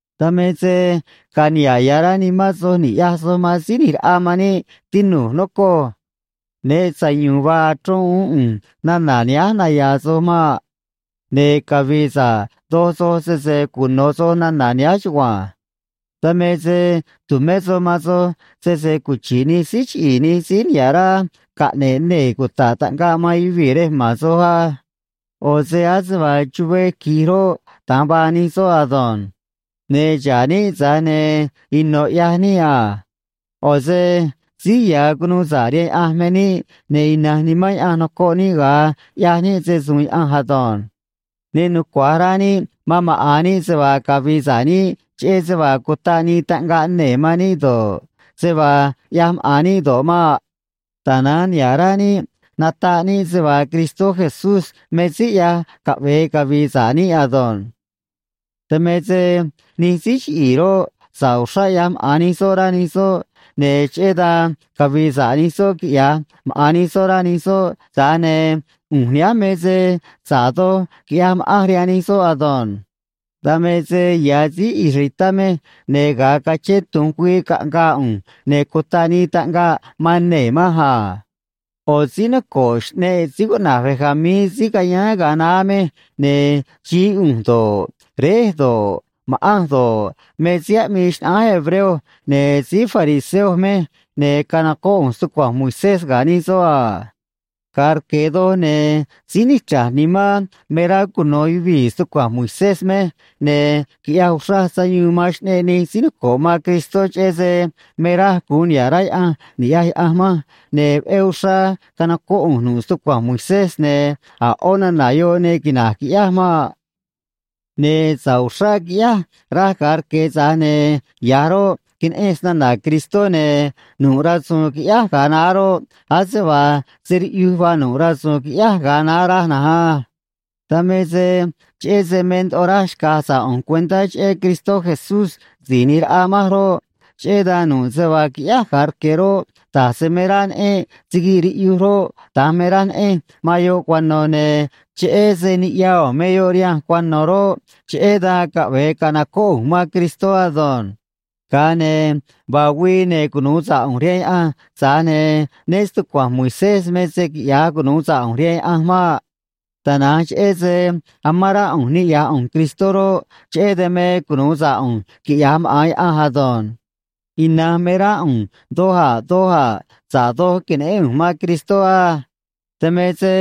Dan me se ga̱a̱ niha̱ꞌ ya̱ rá nimán soj ni̱ꞌyaj soj man Síí ꞌNi̱j Raꞌa man níꞌ, tinu̱j, nocoj. Né sayu̱u̱n vaa achrón uún ꞌu̱nj nana̱ nihánj naya̱a̱ soj maꞌ. Ne̱ cavi̱i̱ sa̱ꞌ doj soj, sese cuno̱ soj nana̱ nihánj chugua̱nj. Dan me se tu̱mé soj man soj sese cuchi̱ꞌ nij síí chiꞌi̱i̱, nij síí niha̱ꞌ rá caꞌne̱ꞌ nee̱ cuta̱ꞌ taꞌngaꞌ man yuvii̱ rej ma̱n soj á. ꞌO̱ se ase vaa chuvee qui̱j roꞌ, da̱nj vaa nij soꞌ ado̱nj. Ne̱ xa̱ꞌ níꞌ, tza̱j ne̱ ino̱ ꞌyaj níꞌ a. ꞌO̱ se síí ya̱ cunuu sa̱ꞌ rihaan Yaꞌanj me níꞌ, ne̱ ina̱nj Nimán Yaꞌanj nocoꞌ níꞌ ga̱a ꞌyaj níꞌ se‑su̱u̱n Yaꞌanj ado̱nj. Ne nucua̱j rá níꞌ man maꞌa̱n níꞌ se vaa cavi̱i̱ sa̱ꞌ níꞌ cheꞌé se vaa cutaꞌ nii taꞌngaꞌ nee̱ man níꞌ do̱ꞌ, se vaa ꞌyaj maꞌa̱n níꞌ do̱ꞌ maꞌ. Tana̱nj niha̱ꞌ rá níꞌ nataꞌ níꞌ se vaa Cristó Jesús me síí ꞌyaj caꞌve̱e cavi̱i̱ sa̱ꞌ níꞌ ado̱nj. Dan me se nij síí chiꞌi̱i̱ roꞌ, sa̱ꞌ uxrá ꞌyaj maꞌa̱n nij soꞌ, rá nij soꞌ, ne̱ cheꞌé dan cavi̱i̱ sa̱ꞌ nij soꞌ quiꞌya̱j maꞌa̱n nij soꞌ, rá nij soꞌ, tza̱j ne̱ ꞌu̱nj nihánj me se sa̱ꞌ doj quiꞌyaj ma̱ꞌanj rihaan nij soꞌ ado̱nj. Dan me se ya̱ síí israelitá mej, ne̱ ga̱a cachén tu̱nj güii caꞌngaa ꞌu̱nj, ne̱ cutaꞌ nii taꞌngaꞌ man nee̱ manj a. ꞌO̱ síí noco̱ꞌ xꞌneꞌ síí cuꞌna̱j Benjamín, síí cayáán ga̱a naá mej, ne̱ xií ꞌu̱nj do̱ꞌ, réj do̱ꞌ, ma̱ꞌanj do̱ꞌ, me síí aꞌmii xnaꞌánj hebreo, ne̱ síí fariseo mej, ne̱ canocóꞌ ꞌu̱nj stucua̱nj Moisés ga̱ nij soꞌ a. Ga̱a rque̱ doj, ne̱ síí nichra̱j nimán me rá cuno̱ yuvii̱ stucua̱nj Moisés mej, ne̱ quiꞌyaj uxraj sayuun man xꞌneꞌ nij síí noco̱ꞌ man Cristó, cheꞌé se me raj gu̱un niha̱ꞌ rá Yaꞌanj ni̱ꞌyaj Yaꞌanj manj, ne̱ veꞌé uxrá canocóꞌ ꞌu̱nj nu̱ꞌ stucua̱nj Moisés, ne̱ a̱ ꞌó nana̱ yoꞌ ne quina̱j, quiꞌyáj maꞌ. Ne̱ sa̱ꞌ uxrá quiꞌyáj, raj ga̱a rque̱, tza̱j ne̱ ya̱j roꞌ, queneꞌenj snana̱ Cristó, ne̱ nu̱ꞌ rasu̱u̱n quiꞌyáj ga̱a naá roꞌ, ase vaa se riꞌyuj vaa nu̱ꞌ rasu̱u̱n quiꞌyáj ga̱a naá, raj na̱nj á. Dan me se cheꞌé se me ndoꞌo raj xca̱j sa̱ꞌ ꞌu̱nj cuentá cheꞌé Cristó Jesús Si̱j ꞌNi̱j Raꞌa manj roꞌ, cheꞌé dan nu̱ꞌ se vaa quiꞌyáj ga̱a rque̱ roꞌ, da̱j se me raj neꞌenj siguiꞌ riꞌyuj roꞌ, da̱nj me raj neꞌenj man yoꞌ cuano̱, ne̱ cheꞌé se niꞌya u̱u̱n me yoꞌ rihanj cuano̱ roꞌ, cheꞌé dan caꞌve̱e ca̱nocóꞌ ꞌu̱nj man Cristó ado̱nj. Ga̱a ne̱ vaa güii, ne̱ cunu̱u sa̱ꞌ ꞌu̱nj rihaan Yaꞌanj, tza̱j ne̱ né stucua̱nj Moisés me se quiꞌya̱j cunu̱u sa̱ꞌ ꞌu̱nj rihaan Yaꞌanj maꞌ. Tana̱nj cheꞌé se amán rá ꞌu̱nj niꞌya̱j ꞌu̱nj Cristó roꞌ, cheꞌé dan me cunu̱u sa̱ꞌ ꞌu̱nj quiꞌya̱j maꞌa̱n Yaꞌanj ado̱nj. Ina̱nj me rá ꞌu̱nj doj a̱ doj a̱ sa̱ꞌ doj que̱neꞌén ꞌu̱nj man Cristó á. Dan me se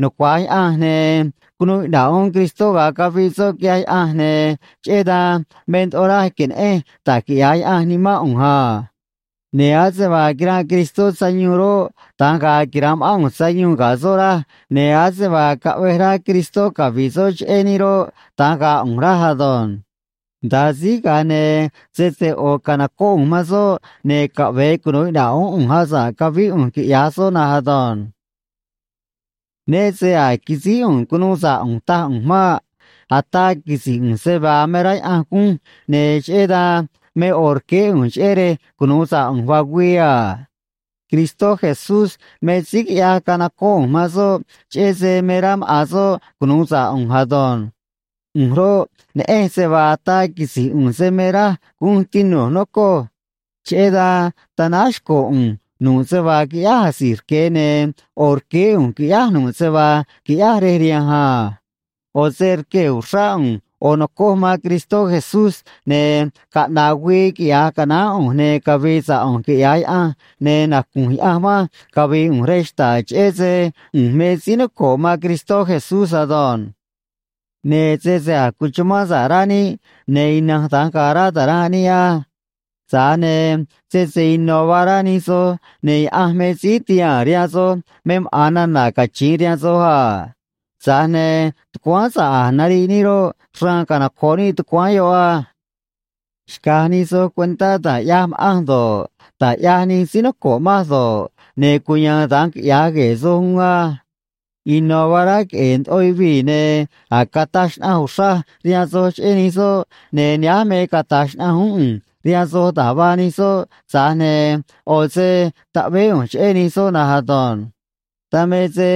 nucua̱j Yaꞌanj, ne̱ cunuu iꞌna̱ꞌ uún Cristó ga̱a caviꞌ soꞌ, quiꞌyaj Yaꞌanj, ne̱ cheꞌé dan me ndoꞌo raj que̱neꞌenj da̱j quiꞌya̱j Yaꞌanj nimán ꞌu̱nj a. Ne̱ ase vaa quiranꞌ Cristó sayuun roꞌ, da̱nj ga̱a̱ quira̱nꞌ ma̱ꞌán ꞌu̱nj sayuun ga̱ soꞌ, raj, ne̱ ase vaa caꞌvej rá Cristó cavi̱ꞌ soꞌ cheꞌé níꞌ roꞌ, da̱nj ga̱a̱ ꞌu̱nj, raj ado̱nj. Nda̱a síj, ga̱a ne̱ sese ꞌo̱ ca̱nocóꞌ ꞌu̱nj man soꞌ, ne̱ caꞌve̱e cunu̱u iꞌna̱ꞌ uún ꞌu̱nj asa̱ꞌ cavíꞌ ꞌu̱nj, quiꞌya̱j soꞌ na̱nj ado̱nj. Né se a̱j quisíj ꞌu̱nj cunuu sa̱ꞌ ꞌu̱nj, taj ꞌu̱nj maꞌ. Ataa quisi̱j ꞌu̱nj se vaa me rá Yaꞌanj gunj, ne̱ cheꞌé dan me ꞌo̱ rqueé ꞌu̱nj, cheꞌé rej cunu̱u sa̱ꞌ ꞌu̱nj vaa güii a. Cristó Jesús me síí quiꞌyaj canocóꞌ ꞌu̱nj man soꞌ, cheꞌé se me rá maꞌa̱n soꞌ cunu̱u sa̱ꞌ ꞌu̱nj ado̱nj. ꞌU̱nj roꞌ, neꞌen se vaa ataa quisi̱j ꞌu̱nj se me raj gunj, tinu̱j, nocoj. Cheꞌé dan tanáj xco̱ ꞌu̱nj nu̱ꞌ se vaa quiꞌyáj asi̱j rque̱, ne̱ ꞌo̱ rqueé ꞌu̱nj qui̱ꞌyáj nu̱ꞌ se vaa qui̱ꞌyáj rej rihanj a. ꞌO̱ se rquee̱ uxrá ꞌu̱nj ꞌo̱ no̱coj man Cristó Jesús, ne̱ caꞌna̱ꞌ güii quiꞌya̱j canaán ꞌu̱nj, ne̱ cavi̱i̱ sa̱ꞌ ꞌu̱nj, quiꞌya̱j Yaꞌanj, ne̱ nacu̱nj Yaꞌanj manj cavi̱i̱ ꞌu̱nj rej xta̱ꞌ, cheꞌé se ꞌu̱nj me síí noco̱ꞌ man Cristó Jesús ado̱nj. Ne̱ sese a̱j cuchumán sa̱ꞌ rá níꞌ, ne̱ ina̱nj da̱nj ga̱a̱ rá ta̱ranꞌ níꞌ á. Tza̱j ne̱ sese ino̱ vaa rá nij soj, ne̱ Yaꞌanj me síí ti̱haa̱n rihaan soj me maꞌa̱n nana̱ cachi̱in rihaan soj a. Tza̱j ne̱ tucuáán sa̱ꞌ a̱j nariꞌ níꞌ roꞌ, xraan canoco̱ꞌ níꞌ tucuáán yoꞌ á. Xca̱j nij soj cuentá da̱j ꞌyaj ma̱ꞌanj do̱ꞌ, da̱j ꞌyaj nij síí noco̱ꞌ manj do̱ꞌ, ne̱ cuya̱a̱n da̱nj quiꞌya̱j gue̱e̱ soj uún á. Ino̱ vaa rá queꞌe̱e̱ ndoꞌo yuvii̱, ne̱ a̱j cataj xnaꞌanj uxraj rihaan soj cheꞌé nij soꞌ, ne̱ nihánj me cata̱j xnaꞌanj uún ꞌu̱nj rihaan soj da̱j vaa nij soꞌ, tza̱j ne̱ ꞌo̱ se taꞌveé ꞌu̱nj cheꞌé nij soꞌ na̱nj ado̱nj. Dan me se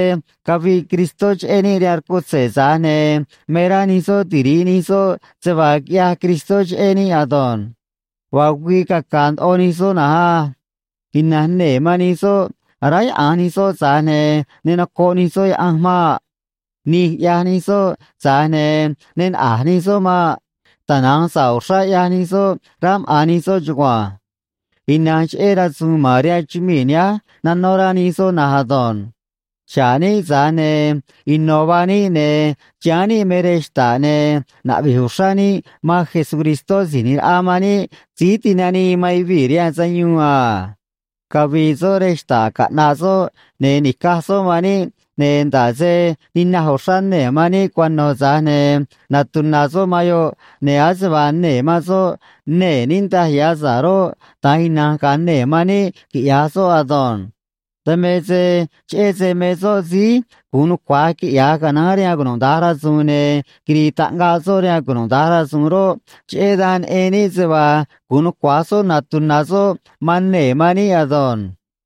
caviꞌ Cristó cheꞌé níꞌ rihaan rcutze̱, tza̱j ne̱ me rá nij soꞌ tiri̱ꞌ nij soꞌ se vaa quiꞌyaj Cristó cheꞌé níꞌ ado̱nj. Vaa güii caca̱a̱ ndoꞌo nij soꞌ na̱nj á. Ina̱nj nee̱ man nij soꞌ aráyaꞌa̱nj nij soꞌ, tza̱j ne̱ ne nocoꞌ nij soꞌ Yaꞌanj maꞌ. Nij ꞌyaj nij soꞌ, tza̱j ne̱ ne naꞌa̱j nij soꞌ maꞌ. Tana̱nj sa̱ꞌ uxrá ꞌyaj nij soꞌ, rá maꞌa̱n nij soꞌ chugua̱nj. Ina̱nj cheꞌé rasu̱u̱n ma̱n rihaan chumii̱ nihánj nanó rá nij soꞌ na̱nj ado̱nj. Xa̱ꞌ níꞌ, tza̱j ne̱ ino̱ vaa níꞌ, ne̱ chiháán níꞌ me rej xta̱ꞌ, ne̱ naꞌvi̱j uxrá níꞌ man Jesucristó Si̱j ꞌNi̱j Raꞌa man níꞌ Síí Tinanii man Yuvii̱ rihaan Sayuun a. Cavi̱i̱ soꞌ rej xta̱ꞌ caꞌna̱ꞌ soꞌ, ne̱ ni̱caj soꞌ man níꞌ, ne̱ nda̱ꞌ se ninaj uxrá nee̱ man níꞌ cuano̱, tza̱j ne̱ natuna̱ soꞌ man yoꞌ, ne̱ ase vaa nee̱ man soꞌ nee̱ niꞌndaj ya̱ sa̱ꞌ roꞌ, da̱nj ina̱nj ga̱a̱ nee̱ man níꞌ, quiꞌya̱j soꞌ ado̱nj. Dan me se cheꞌé se me soꞌ síí gu̱un nucua̱j quiꞌya̱j canaán rihaan cunuda̱nj rasu̱u̱n, ne̱ quiri̱i̱ taꞌngaꞌ soꞌ rihaan cunuda̱nj rasu̱u̱n roꞌ, cheꞌé dan neꞌen níꞌ se vaa gu̱un nucua̱j soꞌ natuna̱ soꞌ man nee̱ man níꞌ ado̱nj.